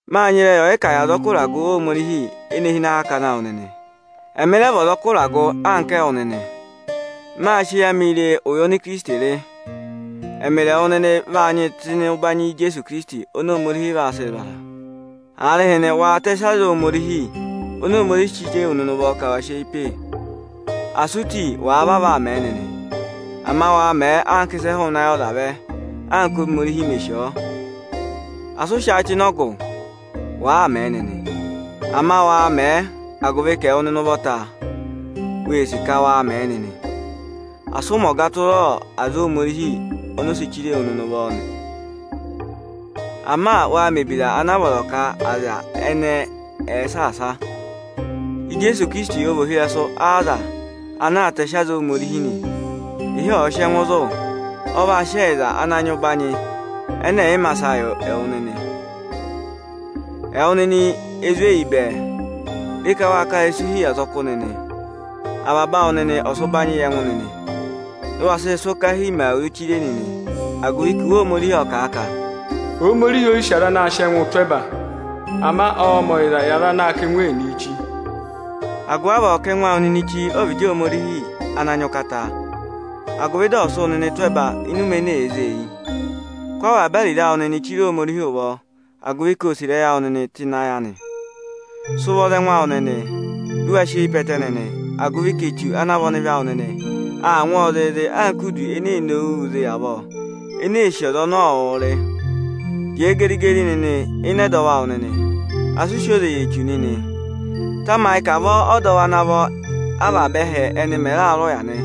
Máa nyị ịrẹyị ọyịkà yi azọkụ ịragụ Ohomorihi ene hi ịnị akakana awụ nịnị. Ẹmị rẹ vị ọzọkụ ịragụ anka ẹwụ nịnị. Mâ sị eyi amị re ụya ọnị Ikirisiti rị. Ẹmịrị ẹwụ nịnị vaa nyịị tụ́ ịnị ụbanyị Ijeesu Ikirisiti oni Ohomorihi vaa sịị zụ̀ aza. Aarịhịnị, waa tẹsị aza Ohomorihi oni Ohomorihi si chire wu nịnị ụvọ ka wa sị eyi pe! Asị u ti, àa vavọọ aa mẹ nịnị; ama waa mẹẹ anka ịsị ẹ hụụnị ayị ọza vẹ, anka Ohomorihi me sì ọ. Asị ụ hụ̀ agụvị ẹkẹhị kẹnẹ mẹẹ nịnị; ama waa mẹẹ, agụvị ka ẹwụ nịnị ụvọta ee sì ka wa mẹẹ nịnị nị. Asị ụ mẹ ọga tụra aza oni Ohomorihi si chire wu nịnị ụvọ, ama waa mẹ̀ ebira ana a vọrọ ka aza ẹnẹẹ ẹ̀ẹ saasa. Ijeesu Ikirisiti ọ vị ohirẹsụ aza ana aa tẹsị aza Ohomorihi nị. Ịhị ọ̀ sị ẹngụ zụ̀, ọ vaa sị ẹyịza ana nyị ụbanyị ẹnẹ ẹ̀ yị ma sa yị wụ nịnị. Ẹwụ nịnị ezweyi bẹẹ, re ka waa ka ịrẹsụ hi yị azọkụ nịnị. Avaba awụ nịnị ọ̀ọ sị ụbanyị yị ẹngụ nịnị, dị ụ waa sị ịrẹsụ ọkahii mẹ awuru chire nịnị, agụvị ka Iwe Ohomorihi ộ kà a ka: Ohomorihi ó yi sì aza anaā sịị ẹngụụ tụ́ ẹba, ama ọọ̄ mẹ̀ ọyịzaa yị aza anaā kà ẹngụ ẹnịnịị chi. Agụvị avọọ, kà ẹngụ awụ nịnị chi ọvịdị Ohomorihi ana nyị ụkata, agụvị dị ọ̀ sị wụ nịnị tụ́ ẹba ịnị ụmẹ ene èe zée eyi. Sị avaba ariro awụ nịnị chire Ohomorihi ụvọ, agụvị ka ọ́ọ sị ịrẹyị awụ nịnị tụ́ ịnị ayị anị. Sị ụvọ za ẹngụ awụ nịnị, dị ụ wa sị eyi pe ẹtẹ nịnị, agụvị ka Echu ana vị ọnịvị awụ nịnị, aa ngwọọ zịịzị anka idu ene ee nowuu zị avọọ, ee sì ọza ọnị ọọ wụụ rị. Jẹẹ geri-geri nịnị ịnị ẹdọwụ awụ nịnị, asị u si oze yi Echu nịnị. Tamayị ka avọọ ọdọwụ ana vọ avaba ẹhẹ ẹnị mẹ̀ raa rị ụya nị.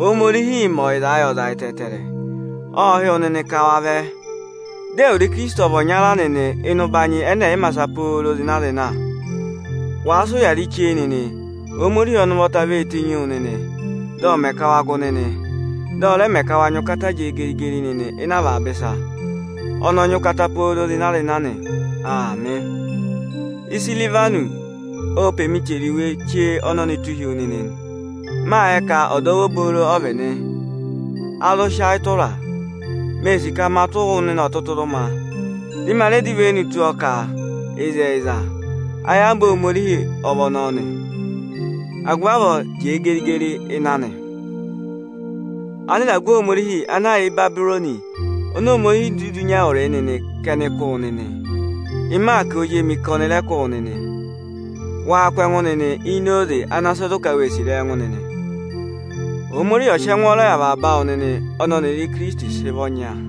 Ohomorihiī mẹ ọyịzaa yị aza ẹtẹẹtẹrẹ, ộ hị́ wụ nịnị ka wa vẹ, dị ẹwụrị Ijeesu ọ̀ vị ọnya nịnị ịnị ụbanyị ẹnẹ ẹ̀ yị ma sa pooro zịna-zịna. Wàa sị ụya rị chee nịnị, Ohomorihi ọnị ụvọta vee tenyi wu nịnị, dị ọ̀ mẹ ka wa gụ nịnị, dị ọ rẹ mẹ ka wa nyị ụkata jẹẹ geri-geri nịnị ịnị avaba ịsa. Ọnị ọ nyị ụkata pooro zịna-zịna nị. Aamị. Isirivanọsị o pe mi chẹrẹ iwe ọnọnị tụ́ hi wu nịnị nị. Mâ yẹ ka ọdọwụ obooro ọ vị nị, a zụ sị ayị tụraa. Mee sì ka ma tụ́ wụ ọtụtụrụma, dị ma rẹ dọ ivenu tụ́ ọ ka ịzẹyịza ayamva Ohomorihi ọ vị ọnọọ nị. Agụvị avọọ, jẹẹ geri-geri ịnị anị nịnị. Anịragụ Ohomorihi ana yà Ịbabịrọnị oni Ohomorihi dudu nyị ẹwụrịị nịnị ka ẹnị kụ́ wụ nịnị. Ịmaakị ozi emi ka ọnị rẹ kụ́ wụ nịnị. Waa kụ́ ẹngụ nịnị ini oze ana sị zụ ka wee sì ịrẹyị ẹngụ nịnị. Ohomorihi ọ̀ sị ẹngwọọrọ yị avaba awụ nịnị ọnị ọnịrị Ikirisiti sị vị ọnya.